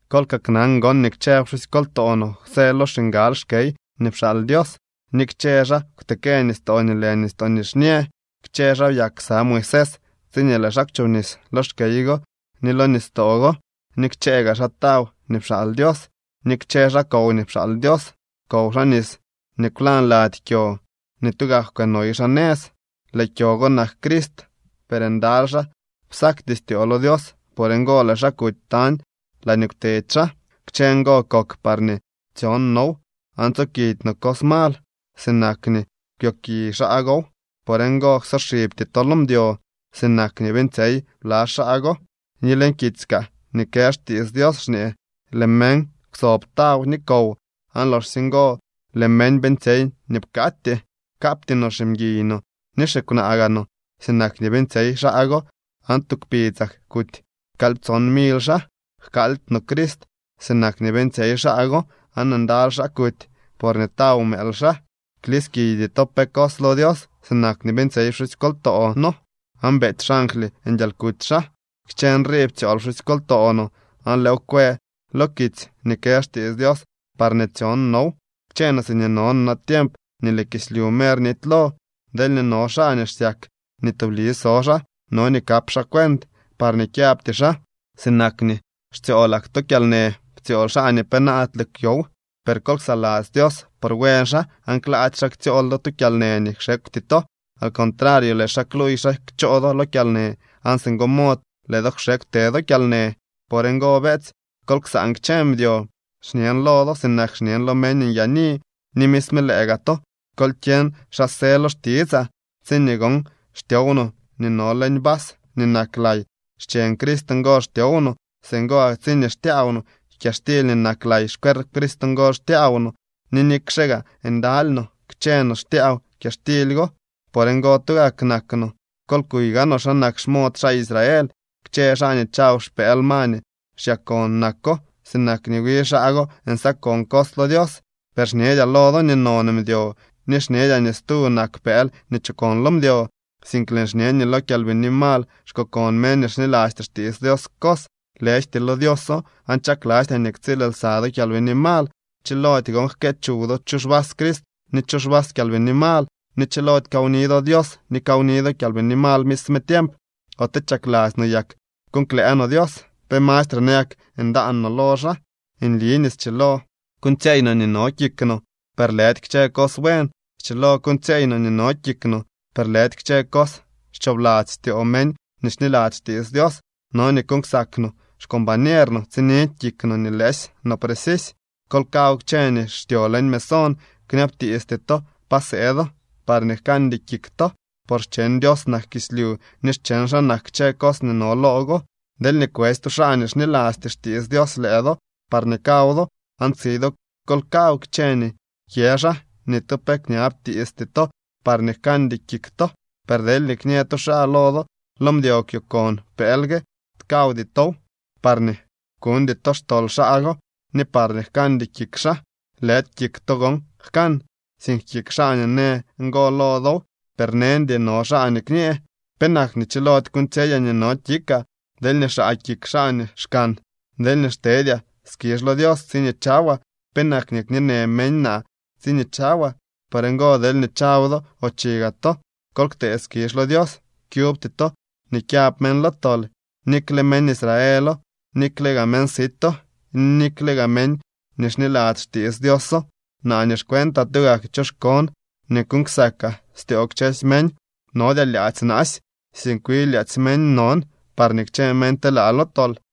Kol kaknan gon nii kchë pxusykoltoo noo kwsë lo xingal xkey nii pxaal Dios ni kchë xaa kwtekë nistoo nii lë Nistoo Nixñë. Kchë xaa byak ksa Moisés tsiñee lëë xaa kwchobnis lo xkey go ni lo nistoo go. Ni kchëë gaa xaa taw nii pxaal Dios, ni kchë xaa kow nii pxaal Dios. Kow xaa nis nii kwlañ lady kyo nii tugak kwënoy xaa nëz. Lëë kyo go nak Crist. Per ndaly xaa psakty styoo lo Dios, por ngo lëë xaa kuty tañ laañee kwtedy xaa. Kchë ngo kok parñee tsyon now aan tsokidy no cos mal, sinak nii kwyoki xaa gow. Por ngo, ksoxibty to lo mdyo, sinak nii beeñtsyey bla xaa go ni leñ kitsy kaa nii kë xtiits Dios xñee: “Lëë meñ kwsob taw ni kow aan loxsye ngo lëë meñ beeñtsyey nii pkatyee.” Kapty no ximguiy no ni xikwnaa gaa no, sinak nii beeñtsyey xaa go aan tu kpidzak kuty kalyptson mily xaa. Jkaaldy no Crist sinak nii beeñtsyey xaa go, aan ndaly xaa kuty porñee taw mëël xaa. Kliskiydy to pe cos lo Dios sinak nii beeñtsyey pxusykoltoo noo, aan beety xangly nguialkuty xaa. Kchë nrii ptsyool pxusykoltoo no aan lëëw kwë lo kitsy nii kë xtiits Dios parñee tsyon now, kchë no siñee no no natiemp nii lëë kislyu mer nitylo. Deelñee no xaa nii xsyak nii tubli so xaa, no nii kap xaa cuent parñee kyabty xaa. Sinak nii xtsyoolak to kyalnë ptsyool xaa nii penaadle kwyow, per kol ksaladzy Dios por buen xaa aan klaady xaa ktsyool do tu kyalnë nii kxekwty to. Al contrario lëë xaa kluuy xa kchoo do lo kyalnë aan singo mod lëë do kxekw te do lo kyalnë. Por ngo, beetsy, kol ksaan kchë mdyo. Xñen lo do sinak xñen lo meñ nyaani ni misme lëë gaa to kol kyeñ xa së lo xtitsaa. Tsiñee gon xtyow no nii no leñ vas nii nak lay, xcheñ Crist ngo xtyow no. Singo gak tsiñee xtyaaw no kyaxtily nii nak lay, xcuerp Crist ngo xtyaaw no. Ni nikxe gaa ndaly no, kchë no xtyaaw kyaxtily go. Por ngo tugak nak no. Kol kuy gaanoo xa nak xmod xaa Israel, kchë xaa nii chaw xpëël ma nii xyakon nako sinak nii wi xaa go nsakon cos lo Dios. Per xñedyaa lo do nii non mdyo ni xñedyaa nii stu nak pëël nii chokon lo mdyo. Sink lëën xñe nii lo kyalbini mal xkokon meñ nii xnilasty xtiits Dios cos, lëjty lo Dioso aan chaklastyaa nii ktsiil lsa do kyalbini mal. Chilody gon jkë chuw do chu xvas Crist ni chu xvas kyalbini mal, ni chilody kawni do Dios ni kawni do kyalbini mal misme tiemp. ¿Ote chakladzy no yak kuuñ klëë no Dios? ¿Pe mastre nayak ndaan no lo xaa? Nli nii schilo kuuñtsyeey no nii no kik no, per lëdy kchë cos buen. Schilo kuuñtsyeey no nii no kik no, per lëdy kchë cos xchoobladzy styoo meñ nii xniladzy xtiits Dios. No nii kuuñ ksak no xcombañer no, tsinidy kik no nii lëësy no precisy. Kol kaw kchë nii xtyo leñ mesón, kñabtiisty to pa sëëdo parñee jkaandy kik to. Por xcheñ Dios nak kislyu ni xcheñ xaa nak kchë cos nii no loo go. Deelñee kwetsy tu xaa nii xnilasty xtiits Dios lëë do parñee kaw do, aan tsi do, kol kaw kchë nii kyë xaa, ni tu pe kñabtiisty to parñee jkaandy kik to. Per deelñee kñë tu xaa lo do: Lo mdyo kwyo kon pëël gue, kawdy tow, parñee kuñdy to xtol xaa go ni parñee jkaandy kik xaa. Lëdy kik to gon jkan, sink kik xaa nii në ngo lo dow. Per neñdy no xaa nii kñë: “¿Penak nii chilody kuuñtsyeyaa nii no kikaa deelñee xaa kik xaa nii xkan? Deelñee xtedyaa skizh lo Dios tsiñee chawaa, ¿penak nii kñeenë meñ naa tsiñee chawaa?” Por ngo, deelñee chaw do o chi gaa to, kol ktee skizh lo Dios. Kyubty to nii kyab meñ lo tol, nikle meñ Israelo, nikle gaa meñ sito, ni nikle gaa meñ nii xniladzy xtiits Dioso. Naa nii xcuentaa, tugak choxkoon nii kuuñ ksakaa styoo kchësy meñ, nodyaa lyaadzy naasy, sink wi lyaadzy meñ non, parñee kchë meñ telaa lo tol.